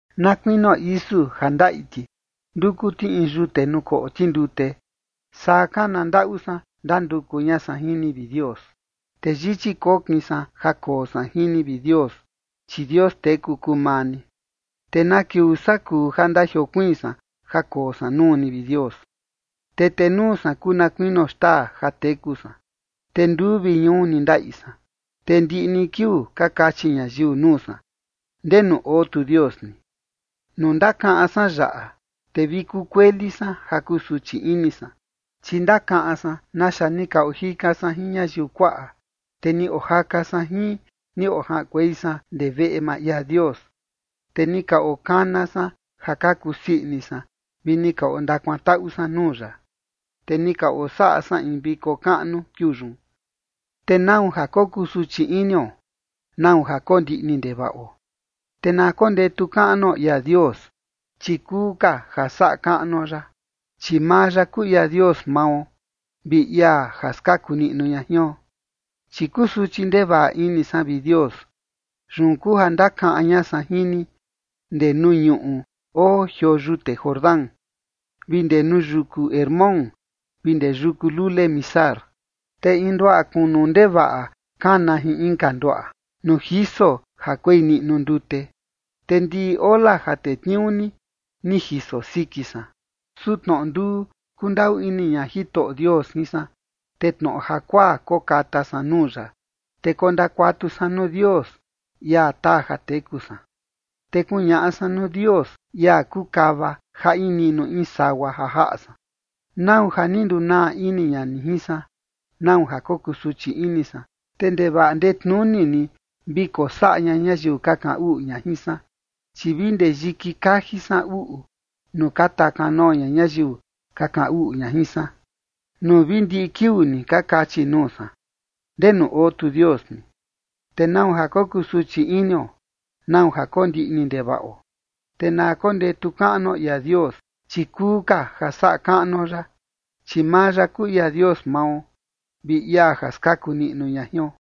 Na kuinio isu ja ndaꞌi ti, nduku ti in yute nuu koꞌo ti ndute, saa kana ndaꞌu san ndanduku ña san jin ni, vi Dios. Te yichi kokin san ja koo san jin ni, vi Dios, chi Dios teku kuu maa ni. ¿Te na kiuu saa kuu ja ndajiokuiin san ja koo san nuu ni, vi Dios? Te tenuu san kuu na kuinio xtaa ja teku san, te nduu vi ñuu ni ndaꞌi san. Te ndiꞌi ni kiuu ka kachi ñayiu nuu san: “¿Ndenu oo tu Dios ni?” Nuu ndakaꞌan san yaꞌa, te vi kukueli san ja kusuchi ini san, chi ndakaꞌan san naxa ni ka ojika san jin ñayiu kuaꞌa, te ni ojaka san jin, ni ojaꞌankuei san ndee veꞌe maa ia Dios. Te ni ka okana san ja ka kusii ini san vi ni ka ondakuantaꞌu san nuu ya, te ni ka osaꞌa san in viko kaꞌnu kiuu yun. ¿Te nau ja kokusuchi inio? ¿Nau ja kondiꞌni ndevaꞌo? Te na kondetu kaꞌnuo ia Dios, chi kuu ka ja saꞌa kaꞌnuo ya, chi maa ya kuu ia Dios mao, vi ia ja skaku niꞌnu ña jion. Chi kusuchi ndevaꞌa ini san, vi Dios. Yun kuu ja ndakaꞌan ña san jin ni ndee nuu ñuꞌu oo jioo yute Jordán vi ndee nuu yuku Hermón vi ndee yuku lule Mizar. Te in nduaꞌa kunu ndevaꞌa kana jin inka nduaꞌa nuu jiso ja kuei niꞌnu ndute, te ndiꞌi ola ja tetniuu ni, ni jiso siki san. Su tnoꞌo nduu kundaꞌu ini ña Jitoꞌo Dios jin san, te tnoꞌo jakuaa kokata san nuu ya. Te kondakuatu san nuu Dios, ia taa ja teku san. Te kuñaꞌa san nuu Dios, ia kuu kava ja in niꞌnu in sagua ja jaꞌa san: “¿Nau ja ni ndunaa ini ña ni jin san? ¿Nau ja kokusuchi ini san, te ndevaꞌa ndetnuni ni vi kosaꞌa ña ñayiu ka kaꞌan uꞌu ña jin san?” Chi vi ndee yiki kaji san uꞌu, nuu ka taa kanoo ña ñayiu ka kaꞌan uꞌu ña jin san, nuu vi ndiꞌi kiuu ni ka kachi nuu san: “¿Ndenu oo tu Dios ni?” ¿Te nau ja kokusuchi inio? ¿Nau ja kondiꞌni ndevaꞌo? Te na kondetu kaꞌnuo ia Dios, chi kuu ka ja saꞌa kaꞌnuo ya, chi maa ya kuu ia Dios mao, vi ia ja skaku niꞌnu ña jion.